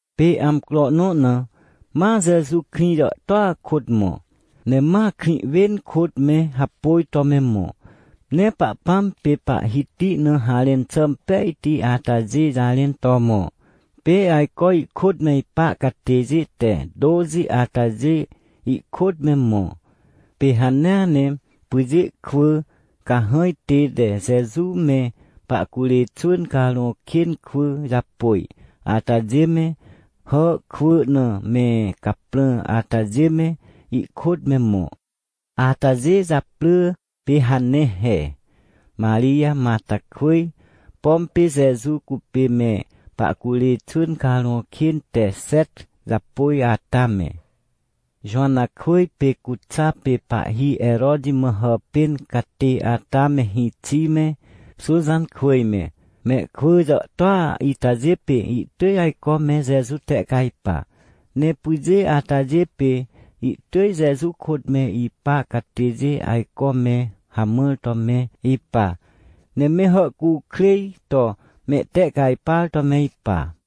Pê amcro nõ na, ma Jeju krĩ jàhtôa kôt mõ, ne ma krĩ wên kôt me hapôj to me mõ, ne Pahpãm pê Pahhiti na harẽn xà impejti atajê jarẽn to mõ. Pê ajco ihkôt me ipa catêjê te tôxi atajê ihkôt me mõ. Pê hanea ne pyjê kwỳ cahãj tête Jeju me pahcurê xwỳn carõ kên kwỳ japôj atajê me, hà kwỳ na me caprã atajê me, ihkôt me mõ. Atajê japrỳ pê hane he: Marij Matarkwỳj, pom pê Jeju cupê me pahcurê xwỳn carõ kên te xet japôj ata me, Jowanakwỳj pê Cuxa pê pahhi Heroti mã hàpên catê ata me hĩxi me, Xuxankwỳj me. Mehkwỳ jàhtôa itajê pê ihtỳj ajco me Jeju tehcajpa, ne pyjê atajê pê ihtỳj Jeju kôt me ipa catêjê ajco me hamãr to me ipa, ne me hàhcukrêj to mehtehcajpar to me ipa.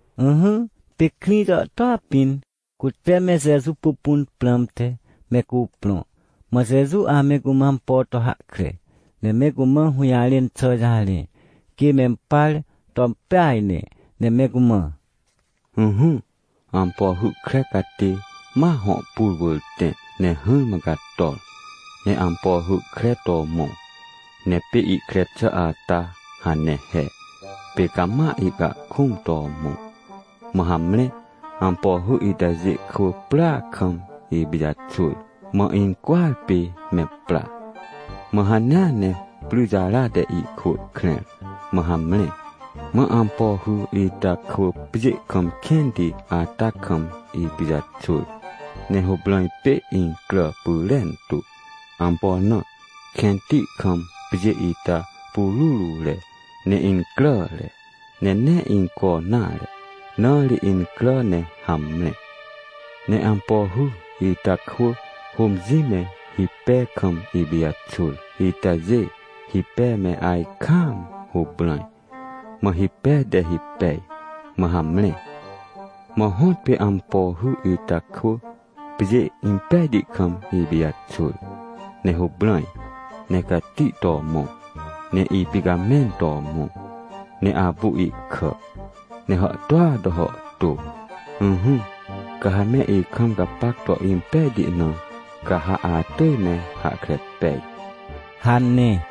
Ỹhỹ, pê krĩ jàhtôa pĩn, cute me Jeju pupun prãmte, me cuprõ. Mã Jeju ame cumã ampo to hahkre, ne me cumã hũjarẽn xà jarẽ, quê mempar to impeaj ne, ne me cumã: ― Ỹhỹ, ampo hy kre catê ma hõ pur wỳr tẽ. Ne hỹrmã cator, ne ampo hy kre to mõ. Ne pê ihkre xà ata hane he, pê cama ihcahkũm to mõ. Mã hamre, ampo hy itajê kwỳ prya kam ipijaxwỳr, mã incwỳar pê me pra, mã hanea ne pryjara te ihkwỳ krẽr, mã hamre. Mã ampo hy ita kwỳ pjê kam kẽnti ata kam ipijaxwỳr, ne huprãj pê incrà pyrentu. Ampo na? Kẽnti kam pjê ita pururure, ne incràre, ne nee inco nare, na ri incrà ne hamre. Ne ampo hy ita kwỳ hômjĩ me hipe kam ipijaxwỳr itajê, hipe me ajkaam huprãj. Mã hipe te hipej, mã hamre. Mã hõtpê ampo hy ita kwỳ pjê impejti kam ipijaxwỳr, ne huprãj, ne cati to mõ, ne ipicamẽn to mõ, ne apu ihkà, ne hàhtôa to hàhtô. Ỹhỹ, ca ha me ikam gapac to impejti na, ca ha atỳj me hahkre pej ― hane.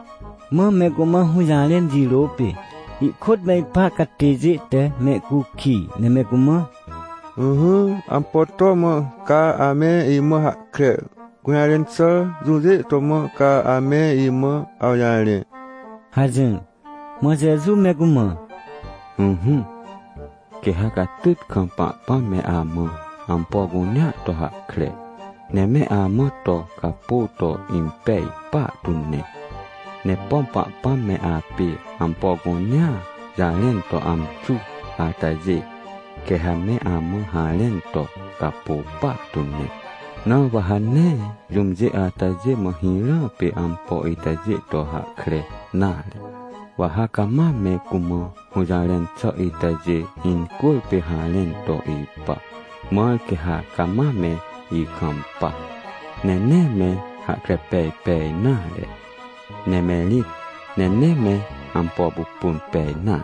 Mã me cumã hũjarẽn jirô pê, ihkôt me ipa catêjê te mehcukij, ne me cumã: ― Ỹhỹ, ampo to mã ca ame imã hahkre? Gũjarẽn xà jũjê to mã ca ame imã awjarẽ? ― hajỹr. Mã Jeju me cumã: ― Ỹhỹ, quê ha catyt kam Pahpãm me amã ampo cunea to hahkre, ne me amã to capô to impej partu ne. Ne pom Pahpãm me apê ampo cunea jarẽn to amxu atajê, quê ha me amã harẽn to capô partu ne. Na wa ha nee jũmjê atajê mã hirã pê ampo itajê to hahkre nare, wa ha cama me cumã hũjarẽn xà itajê incwỳrpê harẽn to ipa, mãr quê ha cama me ikampa, ne nee me hahkre pej pej nare, ne me rĩt, ne nee me ampo pupun pej nare.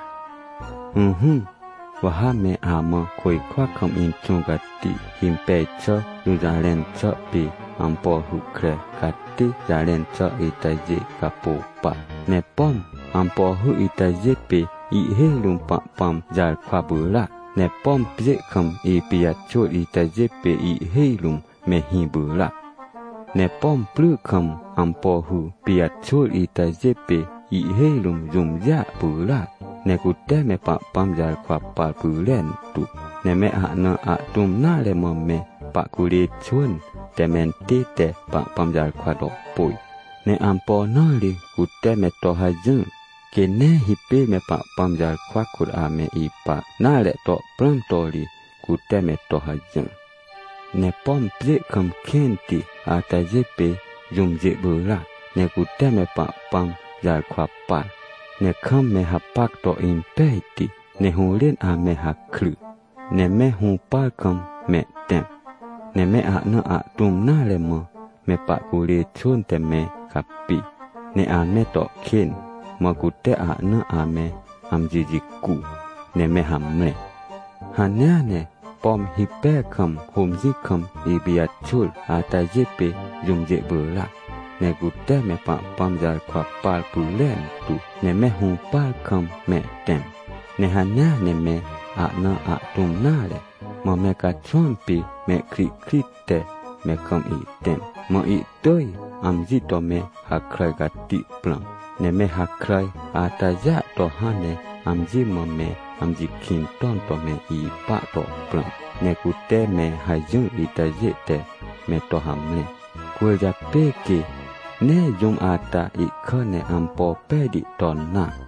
― Ỹhỹ, wa ha me amã côjkwa kam Inxũ Cati himpej xà jũjarẽn xà pê ampo hy kre catê jarẽn xà itajê capô pa. Ne pom ampo hy itajê pê ihhêj rũm Pahpãm jarkwa pyràac, ne pom pjê kam ipijaxwỳr itajê pê ihhêj rũm, mehĩ pyràac. ― Ne pom pry kam ampo hy pijaxwỳr itajê pê ihhêj rũm jũmjêa pyràc, ne cute me Pahpãm jarkwa par pyrentu. Ne me ahna ahtũm nare mã me pahcurê xwỳn te mentête Pahpãm jarkwa to pôj. Ne ampo na ri cute me to hajỹr? Quê nee hipêr me Pahpãm jarkwa kôt ame ipa nare to prãm to ri, cute me to hajỹr. ― Ne pom pjê kam kẽnti atajê pê jũmjê pyràac, ne cute me Pahpãm jarkwa par, ne kam me hapac to impejti, ne hũrên ame hakry, ne me hũpar kam mehtẽm. Ne me ahna ahtũm nare mã me pahcurê xwỳn te me capi, ne ame to kên, mã cute ahna ame amji jicu, ne me hamre. ― Hanea ne, pom hipe kam hômjĩ kam ipijaxwỳr atajê pê jũmjê pyràac, ne cute me Pahpãm jarkwa par pyrentu, ne me hũpar kam mehtẽm. Ne hanea ne me ahna ahtũm nare, mã me caxwãm pê mehkrihkrit te me kam ihtẽm, mã ihtỳj amji to me hakràj cati prãm, ne me hakràj atajêa to hãn ne amji mã me amji kĩn ton to me ipa to prãm. Ne cute me hajỹr itajê te me to hamre. Cwỳrjapê, quê nee jũm ata ihkà ne ampo pejti ton nare.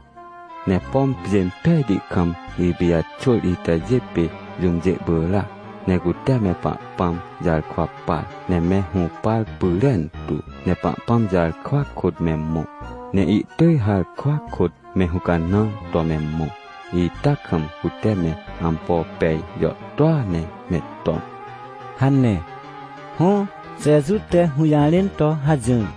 ― Ne pom pjê impejti kam ipijaxwỳr itajê pê jũmjê pyràac, ne cute me Pahpãm jarkwa par, ne me hũpar pyrentu, ne Pahpãm jarkwa kôt me mõ. Ne ihtỳj harkwa kôt me hũcanãr to me mõ, ita kam cute me ampo pej jàhtôa ne me ton ― hane. Hõ, Jeju te hũjarẽn to hajỹr.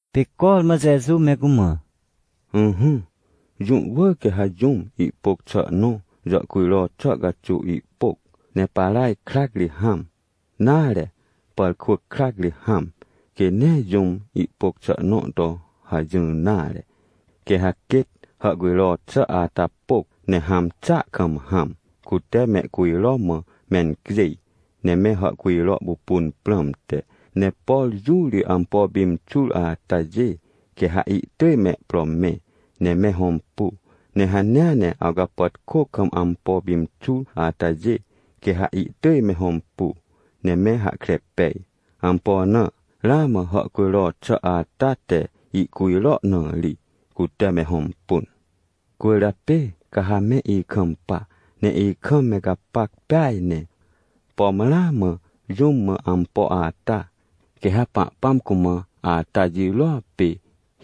Pê cormã Jeju me cumã: ― Ỹhỹ, jũ wỳr quê ha jũm ihpôc xà nõ jàhcujro xà caxuw ihpôc, ne paraj krac ri hãm, nare pàrkwỳc krac ri hãm. Quê nee jũm ihpôc xà nõ to hajỹr nare. Quê ha quêt hàhcujro xà ata pôc ne hãm xàa kam hãm, cute mehcujro mã mencjêj, ne me hàhcujro pupun prãmte. Ne por jũ ri ampo pimxur atajê, quê ha ihtỳj mehpro mẽ, ne me hõmpu. Ne hanea ne awcapàtkô kam ampo pimxur atajê, quê ha ihtỳj me hõmpu, ne me hahkre pej. Ampo na? Ramã hàhcujro xà ata te ihcujro na ri, cute me hõmpun. ― Cwỳrjapê ca ha me ikampa, ne ikam me gapac peaj ne. Pom ramã jũm mã ampo ata, quê ha Pahpãm cumã ata jirôa pê,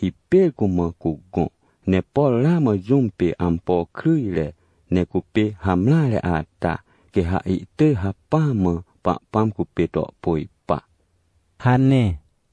hipêr cumã cugõ, ne por ramã jũm pê ampo kryjre, ne cupê hamreare ata, quê ha ihtỳj hacpỹa mã Pahpãm cupê to pôj pa ― hane.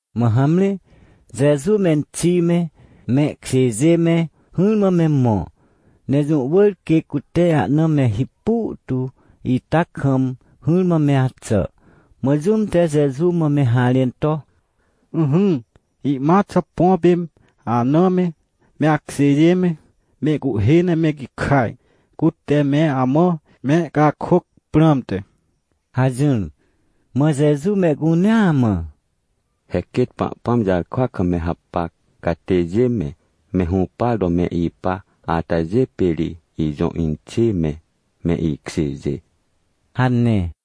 Mã hamre, Jeju menxi me, mehkjêjê me, hỹrmã me mõ. Ne jũ wỳr quê cute ahna me hipu tu ita kam hỹrmã me axà. Mã jũm te Jeju mã me harẽn to: ― Ỹhỹ, ihmat xà põ pê anã me, me akjêjê me, mehcuhhê ne me gikaj, cute me amã mehcakôc prãmte ― hajỹr. Mã Jeju mehcunea mã: ― He quêt Pahpãm jarkwa kam me hapac catêjê me, me hũpar to me ipa atajê pê ri ijõ inxê me, me ikjêjê ― hane.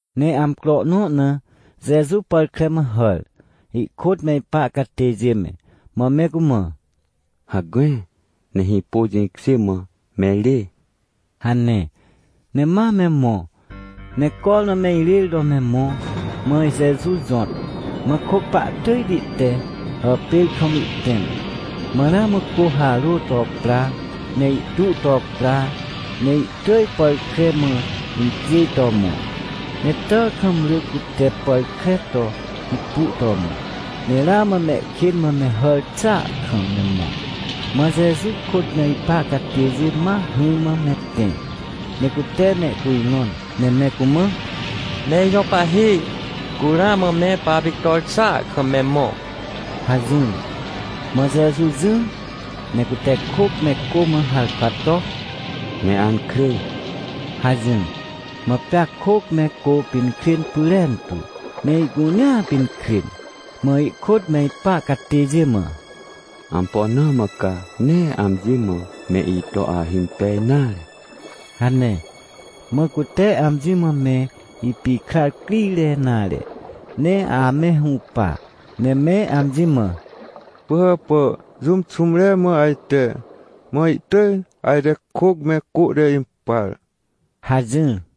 Ne amcro nõ na Jeju pàr kre mã hàr, ihkôt me ipa catêjê me, mã me cumã: ― Hacme, ne hĩpô jĩkjê mã me rê ― hane. Ne ma me mõ. Ne cormã me irêr to me mõ, mã Jeju jõt, mã kôc pahtỳjti te hàpêr kam ihtẽm, mã ramã cô harô to pra, ne ihtu to pra, ne ihtỳj pàr kre mã incjêj to mõ. Ne tàkam ry cute pàr kre to hipu to mõ, ne ramã mehkên mã me hàr xàa kam me mõ. Mã Jeju kôt me ipa catêjê ma hỹrmã me tẽ, ne cute mehcujrõn, ne me cumã: ― Me ijõ Pahhi, cu ramã me papictor xàa kam me mõ ― hajỹr. Mã Jeju jỹr, ne cute kôc me cô mã harkwa to: ― Me ankrê! ― hajỹr. Mã pea kôc me cô pinkrên pyrentu, ne ihcunea pinkrên. Mã ihkôt me ipa catêjê mã: ― Ampo na mã ca nee amji mã me ito ahimpej nare ― hane. Mã cute amji mã me ipikrar crire nare, ne ame hũpa, ne me amji mã: ― Pỳhàpà, jũm xũmre mã ajte? Mã ihtỳj ajte kôc me cô te impar ― hajỹr.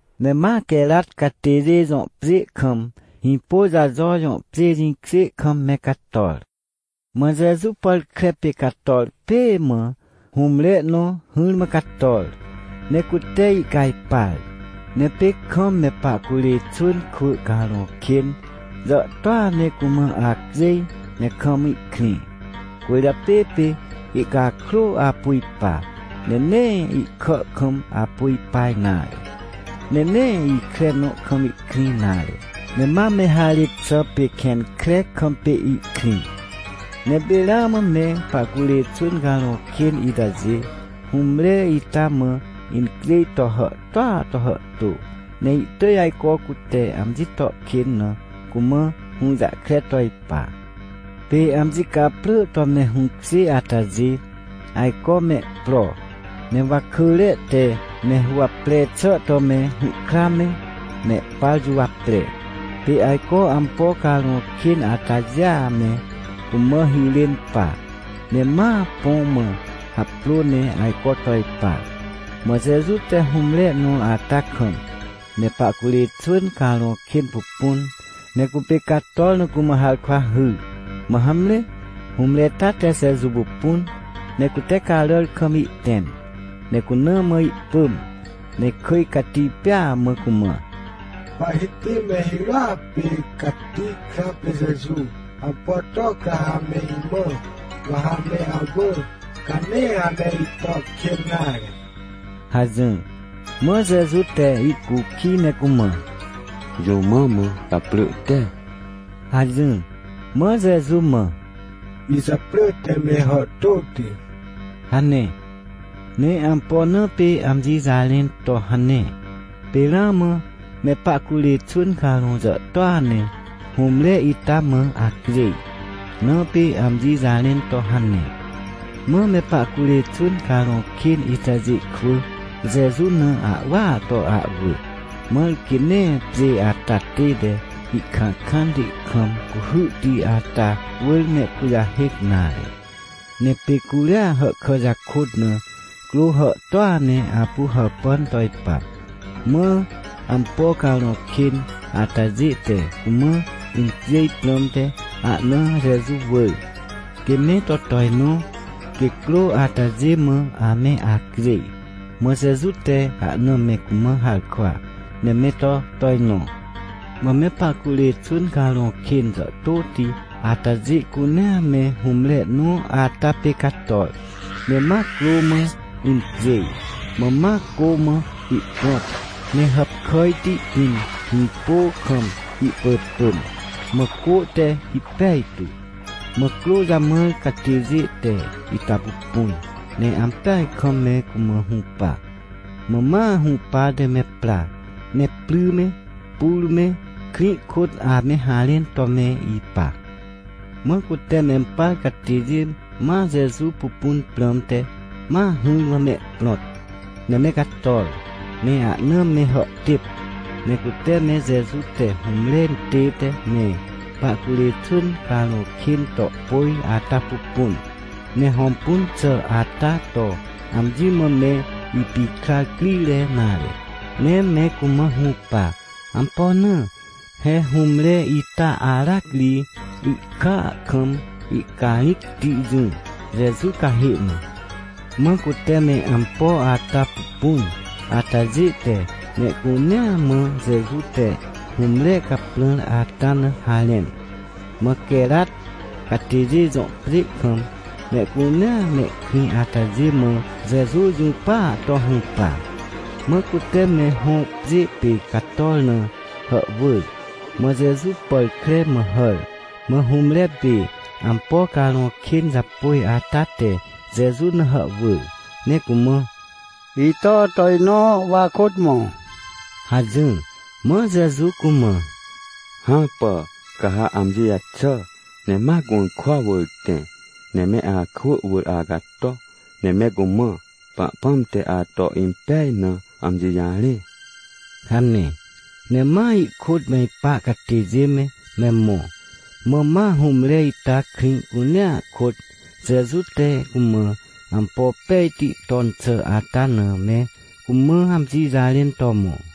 Ne ma, Querat catêjê jõ pjê kam, Hĩpôjajo jõ pjê jĩkjê kam me cator. Mã Jeju pàr kre pê cator pêê mã hũmre nõ hỹrmã cator, ne cute ihcajpar. Ne pê kam me pahcurê xwỳn kwỳ carõ kên jàhtôa ne cumã acjêj ne kam ihkrĩ. Cwỳrjapê pê ihcakrô apu ipa, ne nee ihkà kam apu ipa nare, ne nee ikre nõ kam ihkrĩ nare, ne ma me harêt xà, pê kẽn kre kam pê ihkrĩ. Ne pê ramã me pahcurê xwỳn carõ kên itajê, hũmre ita mã incjêj to hàhtôa to hàhtô, ne ihtỳj ajco cute amji to kên na cumã hũjahkre to ipa. Pê amji caprỳ to me hũkjê atajê ajco mehpro, ne wakỳre te me huwapre xà to me hũhkra me, mehpar juwapre. Pê ajco ampo carõ kên atajêa me cumã hirên pa, ne ma põ mã haprô ne ajco to ipa. Mã Jeju te hũmre nõ ata kam me pahcurê xwỳn carõ kên pupun, ne cupê cator na cumã harkwa hyr. Mã hamre, hũmre ita te Jeju pupun, ne cute caràr kam ihtẽm, ne cuna mã ihpỳm, ne kỳj cati pêa mã cumã: ― Pahhiti me hirôa pê cati kra pê Jeju, ampo to ca ha me imã? Wa ha me awỳ, ca nee ame ito kên nare ― hajỹr. Mã Jeju te ihcukij, ne cumã: ― Jũ mã mã gaprỳ te? ― hajỹr. Mã Jeju mã: ― Ijaprỳ te Me Hàhtôti ― hane. Ne ampo na pê amji jarẽn to hane? Pê ramã me pahcurê xwỳn carõ jàhtôa ne hũmre ita mã acjêj, na pê amji jarẽn to hane. Mã me pahcurê xwỳn carõ kên itajê kwỳ Jeju na ahwỳa to ahwỳ, mãr quê nee pjê ata tête ihkãkãnti kam cuhyhti ata wỳr mehkujahêc nare. Ne pê curia hàhkà jakôt na crô hàhtôa ne apu hàpàn to ipa. Mã ampo carõ kên atajê te cumã incjêj prãmte ahna Jeju wỳr, quê me to tojnõ, quê crô atajê mã ame acjêj. Mã Jeju te ahna me cumã harkwa, ne me to tojnõ. Mã me pahcurê xwỳn carõ kên jàhtôti atajê cunea me hũmre nõ ata pê cator, ne ma crô mã incjêj. Mã ma cô mã ihprõt, ne hàpkàjti pĩn hĩpô kam ihpỳpỳm, mã cô te hipej tu. Mã crô jamãr catêjê te ita pupun, ne ampeaj kam me cumã hũpa. Mã ma hũpate me pra, ne pry me, pur me, krĩ kôt ame harẽn to me ipa. Mã cute mempar catêjê ma Jeju pupun prãmte, ma hỹrmã mehprõt. Ne me cator, ne ahna me hàhtêp, ne cute me Jeju te hũmre intête me pahcurê xwỳn carõ kên to pôj ata pupun, ne hõmpun xà ata to amji mã me ipikrar crire nare, ne me cumã hũpa. Ampo na? He hũmre ita aracri ihkàa kam ihcarĩcti jỹ, Jeju cahê na. Mã cute me ampo ata pupun atajê te mehcunea mã Jeju te hũmre caprãr ata na harẽn. Mã Querat catêjê jõ pjê kam mehcunea mehkrĩ atajê mã Jeju jũpaa to hũpa, mã cute me hõ pjê pê cator na hàhwỳr. Mã Jeju pàr kre mã hàr. Mã hũmre pê ampo carõ kên japôj ata te Jeju na hàhwỳr, ne cumã: ― Ito tojnõ, wa akôt mõ ― hajỹr. Mã Jeju cumã: ― Hãpà, ca ha amji jaxà, ne ma gũrkwa wỳr tẽ, ne me akwỳ wỳr acato, ne me cumã Pahpãm te ato impej na amji jarẽ ― hane. Ne ma ihkôt me ipa catêjê me, me mõ. Mã ma hũmre ita krĩ cunea kôt Jeju te cumã ampo pejti ton xà ata na me cumã amji jarẽn to mõ.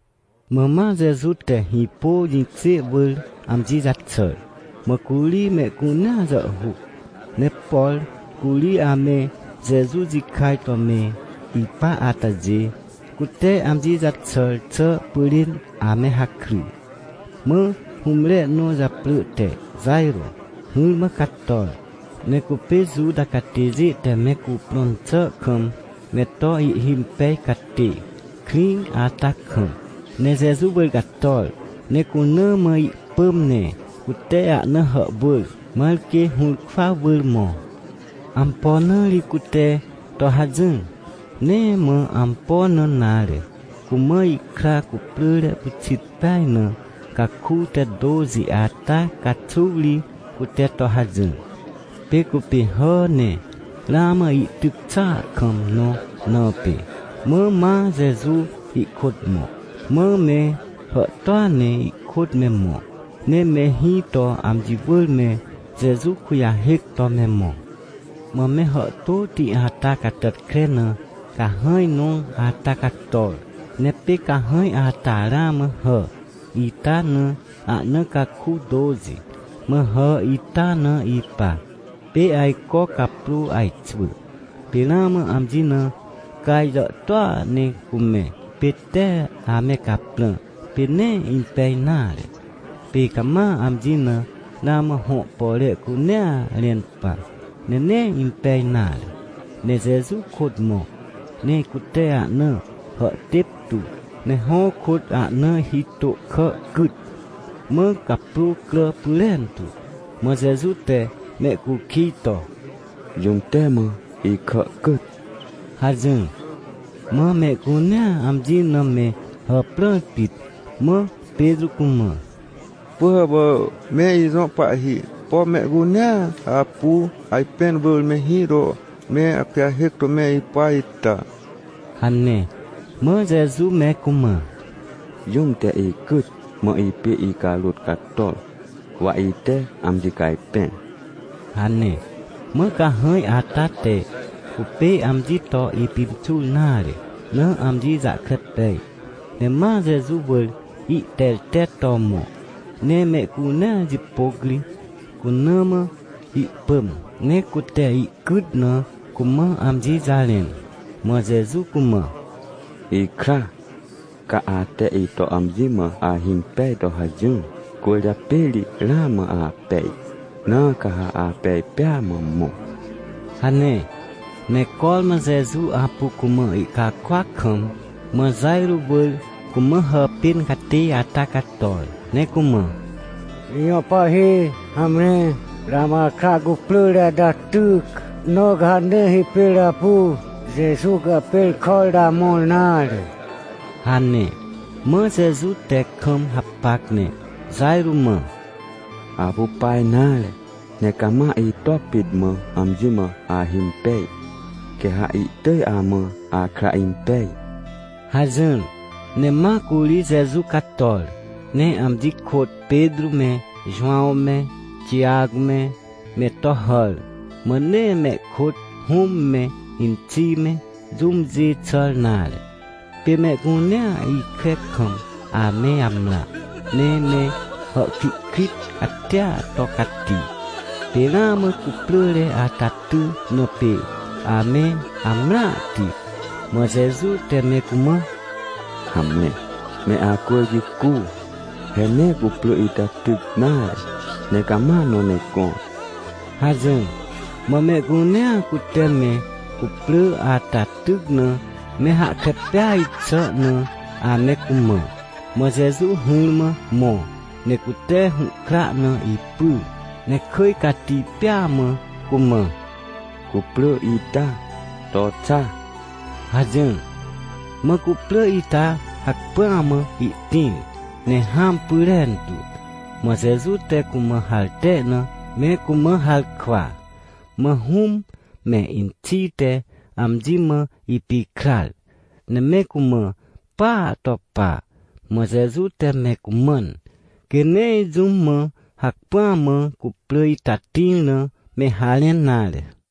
Mã ma Jeju te hĩpô jĩkjê wỳr amji jaxàr. Mã curi mehcunea jàhhuc. Ne por curi ame Jeju jikaj to me ipa atajê, cute amji jaxàr xà pyrên ame hakry. Mã hũmre nõ japrỳ te Jajrô hỹrmã cator, ne cupê Juta catêjê te me cuprõn xà kam me to ihhimpej catê, krĩ ata kam. Ne Jeju wỳr cator, ne cuna mã ihpỳm ne cute ahna hàhwỳr, mãr quê hũrkwa wỳr mõ. Ampo na ri cute to hajỹr? Nee mã ampo na nare, cumã ihkra cuprỳre pyxit peaj na caku te tôxi ata caxuw ri, cute to hajỹr. Pê cupê hà ne ramã ihtyc xàa kam nõ na pê. Mã ma Jeju ihkôt mõ. Mã me hàhtôa ne ihkôt me mõ, ne me hĩ to amji wỳr me Jeju kujahêc to me mõ. Mã me hàhtôti ata catàtkre na cahãj nõ ata cator, ne pê cahãj ata ramã hà ita na ahna caku tôxi, mã hà ita na ipa. Pê ajco caprô ajxwỳ, pê ramã amji na caj jàhtôa ne cumẽ, pê tee ame caprã, pê nee impej nare. Pê cama amji na ramã hõ pore cunea rẽn pa, ne nee impej nare. Ne Jeju kôt mõ, ne cute ahna hàhtêp tu, ne hõ kôt ahna hitô kà cyt. Mã caprô crà pyrentu. Mã Jeju te mehcukij to: ― Jũm te mã ikà cyt? ― hajỹr. Mã mehcunea amji na me hàprãr pit, mã Petrô cumã: ― Pỳhàpà me ijõ pahhi, pom mehcunea apu ajpẽn wỳr me hĩ to me akujahêc to me ipa ita? ― hane. Mã Jeju me cumã: ― Jũm te icyt, mã ipê icarôt cator, wa ite amji cajpẽr ― hane. Mã cahãj ata te cupê amji to ipimxur nare na amji jahkre pej, ne ma Jeju wỳr ihtertet to mõ, ne mehcunea jipôc ri, cuna mã ihpỳm, ne cute ihcyt na cumã amji jarẽn. Mã Jeju cumã: ― Ikra, ca ate ito amji mã ahimpej to hajỹr, cwỳrjapê ri ramã apej. Na ca ha apej pêa mã mõ ― hane. Ne cormã Jeju apu cumã ihcakôac kam, mã Jajrô wỳr cumã hàpên catê ata cator, ne cumã: ― Ijõ pahhi, hamre, ramã akra cuprỳre ata tyc, na ca ha nee hipêr apu Jeju cahpêrkàr to amõr nare ― hane. Mã Jeju te kam hapac, ne Jajrô mã: ― Apu pa nare, ne cama ito pit mã amji mã ahimpej, quê ha ihtỳj amã akra impej ― hajỹr. Ne ma curi Jeju cator, ne amji kôt Petrô me Jowãw me Tijac me, me to hàr, mã nee mehkôt hũm me inxi me, jũmjê xàr nare. Pê mehcunea ikre kam ame amrã, ne me hàhkrihkrit catia to cati, pê ramã cuprỳre ata ty na pê ame amrãhti. Mã Jeju te me cumã: ― Hamre, me acwỳr jicu, he nee cuprỳ ita tyc nare, ne cama nõ ne gõr ― hajỹr. Mã mehcunea, cute me cuprỳ ata tyc na me hahkre peaj xà na ame cumã. Mã Jeju hỹrmã mõ, ne cute hũhkra na ipyr, ne kỳj cati pêa mã cumã: ― Cuprỳ ita, to xa! ― hajỹr. Mã cuprỳ ita hacpỹa mã ihtĩr, ne hãm pyrentu. Mã Jeju te cumã harte na me cumã harkwa. Mã hũm me inxi te amji mã ipikrar, ne me cumã paa to pa, mã Jeju te me cumãn, quê nee jũm mã hacpỹa mã cuprỳ ita tĩr na me harẽn nare.